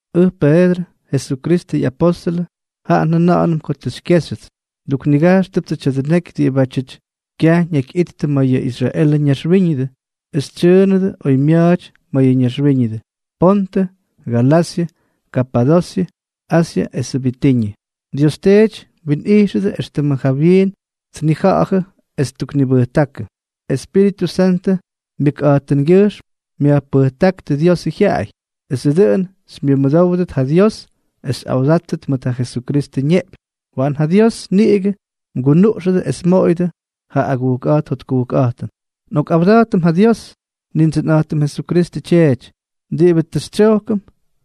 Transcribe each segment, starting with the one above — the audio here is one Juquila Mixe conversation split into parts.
Ʉj Peedrʉ, Jesukristʉ ꞌyapóstʉlʉ, jaꞌa njʉna̱ꞌa̱nʉm ko tʉ xykyéxyʉts. Nduknigajxtʉptsʉ tya̱dʉ neky diꞌibátyʉty kyaj ñakyꞌittʉ ma̱ yʉ Israelʉ ñaxwíñʉdʉ, es tsyʉʉnʉdʉ oymya̱a̱ty ma̱ yʉ ñaxwíñʉdʉ: Pontʉ, Galasyʉ, Kapadosyʉ, Asyʉ esʉ Bitiñʉ. Dios Teety mwinꞌijxʉdʉ éxtʉmʉ jawyiin tnija̱ꞌa̱jʉ es ttuknibʉjtákʉ. Espíritʉ Santʉ myʉkꞌa̱jtʉngyʉjxm myajpʉjtáktʉ Diosʉ jyaꞌay, esʉ dʉꞌʉn xymyʉmʉdówdʉt ja Dios es mwa̱ꞌa̱tstʉt mʉt ja Jesukristʉ ñeꞌpyñ. Waꞌan ja Dios niꞌigʉ mgunuꞌxʉdʉ es mmoꞌoyʉdʉ ja agujkꞌa̱jt jotkujkꞌa̱jtʉn. Nꞌokꞌawda̱jtʉm ja Dios, Nindsʉnꞌa̱jtʉm Jesukristʉ Tyeety, diꞌibʉ tʉ xytsyojkʉm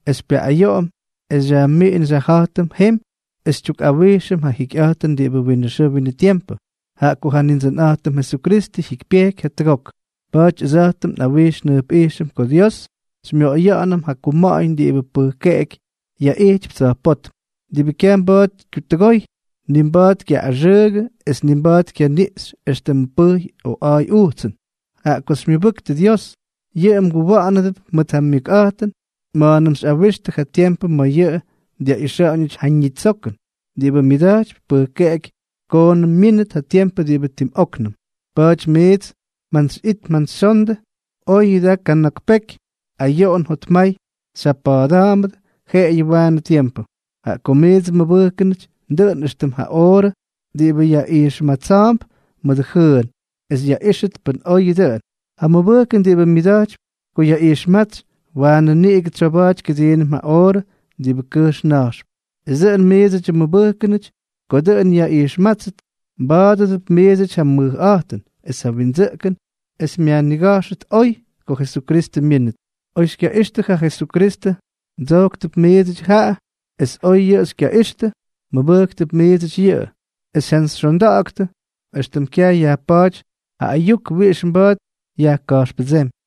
es xypyaꞌꞌayoꞌom es xyajmiꞌin xyajja̱jtʉm jemy es xytyukꞌawijxʉm ja jikyꞌa̱jtʉn diꞌibʉ winʉ xʉʉ winʉ tiempʉ, jaꞌa ko ja Nindsʉnꞌa̱jtʉm Jesukristʉ jyikypyejky jatʉgok. Pa̱a̱ty ʉdsa̱jtʉm nꞌawijx njʉjpꞌijxʉm ko Dios xymyoꞌoya̱ꞌa̱nʉm ja kuma̱ꞌa̱ñ diꞌibʉ pʉjkeꞌeky yaꞌijtypy tsa̱jpótm, diꞌibʉ kyaj mba̱a̱t kyutʉgoy, ni mba̱a̱t kyaꞌꞌaxʉʉgʉ es ni mba̱a̱t kyaniꞌxy éxtʉmʉ pʉjy o a̱a̱y ujtsʉn. Jaꞌa ko xymyʉbʉktʉ Dios, yʉꞌʉ mguwa̱ꞌa̱nʉdʉp mʉt ja myʉkꞌa̱jtʉn ma̱a̱nʉm xyꞌawixtʉ ja tiempʉ ma̱ yʉꞌʉ dyaꞌixa̱ꞌa̱ñʉty ja ñitsokʉn, diꞌibʉ myʉda̱jtypy pʉjkeꞌeky koonʉm myínʉt ja tiempʉ diꞌibʉ tim óknʉm. Pa̱a̱ty miits mjantsyꞌit mjantsyxyondʉ, oyʉ daa kana̱k peky ayoꞌon jotmay xyjapa̱a̱da̱a̱mbʉdʉ jeꞌeyʉ waanʉ tiempʉ. Jaꞌa ko miidsʉ mmʉbʉjkʉnʉty, dʉꞌʉn éxtʉm ja oorʉ diꞌibʉ yaꞌijxmatsa̱a̱mp mʉdʉ jʉʉn es yaꞌíxʉt pʉn oyʉ dʉꞌʉn. Ja mʉbʉjkʉn diꞌibʉ myʉmadakypy ko yaꞌijxmátsy, waanʉ niꞌigʉ tsoba̱a̱ty kʉdiinʉm ja oorʉ diꞌibʉ kʉjx na̱jxp, es dʉꞌʉn miidsʉdyʉ mmʉbʉjkʉnʉty ko dʉꞌʉn yaꞌijxmátsʉt, mba̱a̱dʉdʉp miidsʉty ja mʉjꞌa̱jtʉn es ja windsʉꞌkʉn es myajniga̱jxʉt oy ko Jesukristʉ myínʉt. Oy xykyaꞌixtʉ ja Jesukristʉ, mdsojktʉp miidsʉty jaꞌa; es oy yʉꞌʉ xykyaꞌixtʉ, mmʉbʉjktʉp miidsʉty yʉꞌʉ es mjantsyxyonda̱ꞌa̱ktʉ éxtʉm kyaj yajpa̱a̱ty ja ayuk wiꞌix mba̱a̱t yajka̱jxpʉdsémy,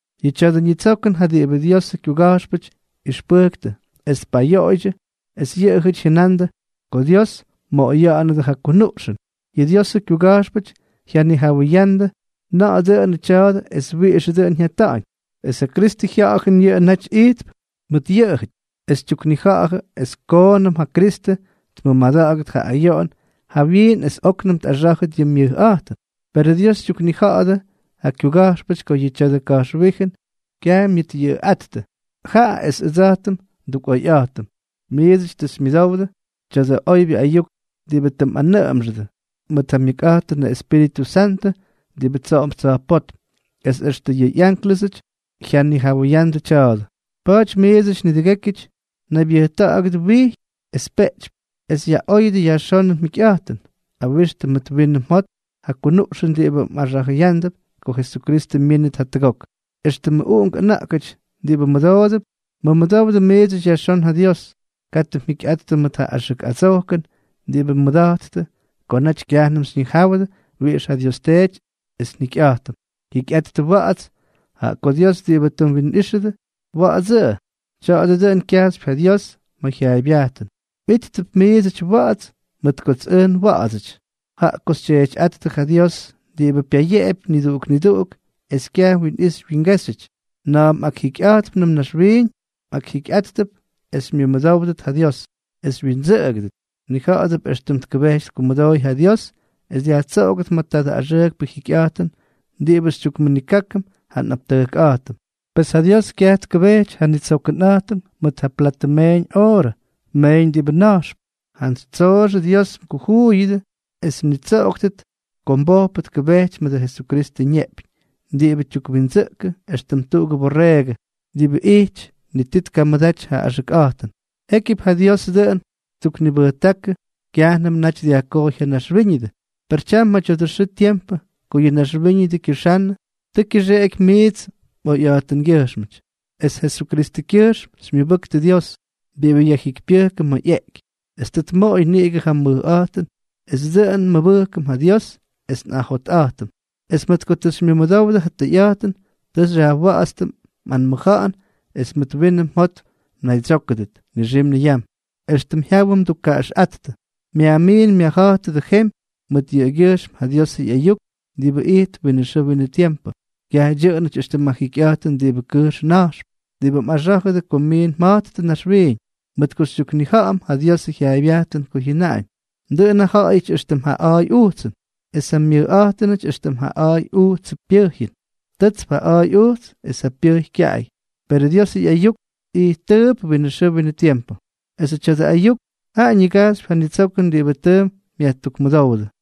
Yʉ tya̱dʉ nitsokʉn jaꞌa diꞌibʉ Diosʉ kyuga̱jxpʉty ꞌyʉxpʉjktʉ es tpayoꞌoydyʉ, es yʉꞌʉjʉty jʉnandʉ ko Dios mmoꞌoya̱ꞌa̱nʉdʉ ja kunuꞌxʉn. Yʉ Diosʉ kyuga̱jxpʉty jyanijawʉyandʉ na̱ꞌa̱ dʉꞌʉnʉ tya̱a̱dʉ es wiꞌixʉ dʉꞌʉn jyata̱ꞌa̱ñ. Es ja Kristʉ Jya̱ꞌa̱jʉn yʉꞌʉ naty ijtp mʉt yʉꞌʉjʉty, es tyuknija̱ꞌa̱jʉ es koonʉm yʉ Kristʉ tmʉmada̱ꞌa̱gʉt ja ayoꞌon jawyiin es óknʉm tꞌaxá̱jʉt yʉ myʉjꞌa̱jtʉn. Perʉ Dios tyuknija̱ꞌa̱dʉ ja kyuga̱jxpʉty ko yʉ tya̱dʉ ka̱jxwíjʉn kyaj myʉtꞌyʉꞌʉꞌáttʉ, jaꞌa es ʉdsa̱jtʉm ndukꞌoyꞌa̱jtʉm. Miidsʉty tʉ xymyʉdowdʉ tya̱dʉ oybyʉ ayuk diꞌibʉ tʉ mꞌanʉꞌʉmxʉdʉ mʉt ja myʉkꞌa̱jtʉnʉ Espíritʉ Santʉ diꞌibʉ tsoꞌon tsa̱jpótm, es extʉ yʉ ánklʉsʉty jyanijawʉyandʉ tya̱a̱dʉ. Pa̱a̱ty, miidsʉty nidʉgékyʉty, naybyʉjta̱ꞌa̱gʉdʉ wijy es peꞌtypy, es yaꞌóyʉdʉ yajxónʉ mjikyꞌa̱jtʉn. Awixtʉ mʉt winʉ mjot ja kunuꞌxʉn diꞌibʉ mꞌaxa̱jʉyándʉp ko Jesukristʉ myínʉt jatʉgok. Extʉmʉ uꞌunk ʉna̱ꞌkʉty diꞌibʉ mʉdoodʉp, mʉmʉdowdʉ miidsʉty yajxón ja Dios. Katʉ mjikyꞌattʉ mʉt ja axʉk adsojkʉn diꞌibʉ mmʉda̱jttʉ ko naty kyajnʉm xyñijáwʉdʉ wiꞌix ja Dios ttseky es njikyꞌa̱jtʉm. Jikyꞌattʉ wa̱ꞌa̱ts, jaꞌa ko Dios diꞌibʉ tʉ mwinꞌijxʉdʉ, wa̱ꞌa̱dsʉꞌʉ; tya̱a̱dʉ dʉꞌʉn kyajxypy ja Dios ma̱ jyaaybyajtʉn: “Mꞌíttʉp miidsʉty wa̱ꞌa̱ts, mʉt kots ʉj nwa̱ꞌa̱dsʉty.” Jaꞌa ko xyTyeetyꞌáttʉ ja Dios, diꞌibʉ pyayeꞌepy niduꞌuk niduꞌuk, es kyaj wyinꞌixy wyingéxyʉty, na̱a̱m mꞌakjikyꞌa̱jtpnʉm naxwiiñ, mꞌakjikyꞌáttʉp es xymyʉmʉdówdʉt ja Dios, es xywyindsʉꞌʉgʉdʉt. Mnija̱ꞌa̱dʉp éxtʉm tkʉbejty tkumʉdooy ja Dios es dyajtsoꞌogʉt ma̱ tadʉ axʉʉkpʉ jikyꞌa̱jtʉn diꞌibʉ xytyukmʉnikákʉm ja nꞌaptʉjkꞌa̱jtʉm. Pes ja Dios kyaj tkʉbejty ja nnitsokʉnꞌa̱jtʉm mʉt ja platʉ meeñ oorʉ meeñ diꞌibʉ na̱jxp; jantsy tsooxʉ Dios mgujuuyʉdʉ es mnitsoꞌoktʉt ko mbojpʉ tkʉbejty mʉdʉ Jesukristʉ ñeꞌpyñ diꞌibʉ tyukwindsʉꞌkʉ éxtʉm tuꞌugʉ borreegʉ diꞌibʉ ni tii tkamʉdaty ja axʉkꞌa̱jtʉn. Jékyʉp ja Diosʉ dʉꞌʉn ttuknibʉjtákʉ kyajnʉmʉ naty dyajkojy ja naxwíñʉdʉ, per tyam ma̱ tya̱dʉ xʉʉ tiempʉ ko yʉ naxwíñʉdʉ kyʉxannʉ, tʉ kyʉxeꞌeky miits mꞌoyꞌa̱jtʉngyʉjxmʉty. Es Jesukristʉkyʉjxm xymyʉbʉktʉ Dios, diꞌibʉ yajjikypyʉjkʉ ma̱ ꞌyeꞌky es tʉ tmoꞌoy niꞌigʉ ja mʉjꞌa̱jtʉn, es dʉꞌʉn nmʉbʉjkʉm ja Dios es nꞌajotꞌa̱jtʉm. Es mʉt ko tʉ xymyʉmʉdowdʉ ja tʉyꞌa̱jtʉn, tʉ xyajwa̱ꞌa̱tstʉ mꞌanmʉja̱ꞌa̱n es mʉt winʉ mjot mnaydsyókʉdʉt nixim niyam, éxtʉm jyawʉ mdukkaꞌaxꞌáttʉ. Pesʉ myajmiin myajja̱jtʉdʉ jemy mʉt yʉꞌʉgyʉjxm ja Diosʉ ꞌyayuk diꞌibʉ ijtp winʉ xʉʉ winʉ tiempʉ; kyaj dyʉꞌʉnʉty éxtʉm ja jikyꞌa̱jtʉn diꞌibʉ kʉjxp na̱jxp, diꞌibʉ mꞌaxá̱jʉdʉ ko mmiin mja̱jttʉ naxwiiñ, mʉt ko xytyuknija̱ꞌa̱m ja Diosʉ jyaaybyajtʉn ko jyʉnaꞌañ: Dʉꞌʉn ja ja̱ꞌa̱yʉty éxtʉm ja a̱a̱y ujtsʉn, es ja myʉjꞌa̱jtʉnʉty éxtʉm ja a̱a̱y ujtsʉ pyʉjyʉn. Tʉtsp ja a̱a̱y ujts es ja pyʉjy kyaꞌay; perʉ Dios ꞌyayuk, ijttʉʉp winʉ xʉʉ winʉ tiempʉ. Esʉ tya̱dʉ ayuk jaꞌa ñigajxypy ja nitsokʉn diꞌibʉ tʉ myajtukmʉdówdʉ.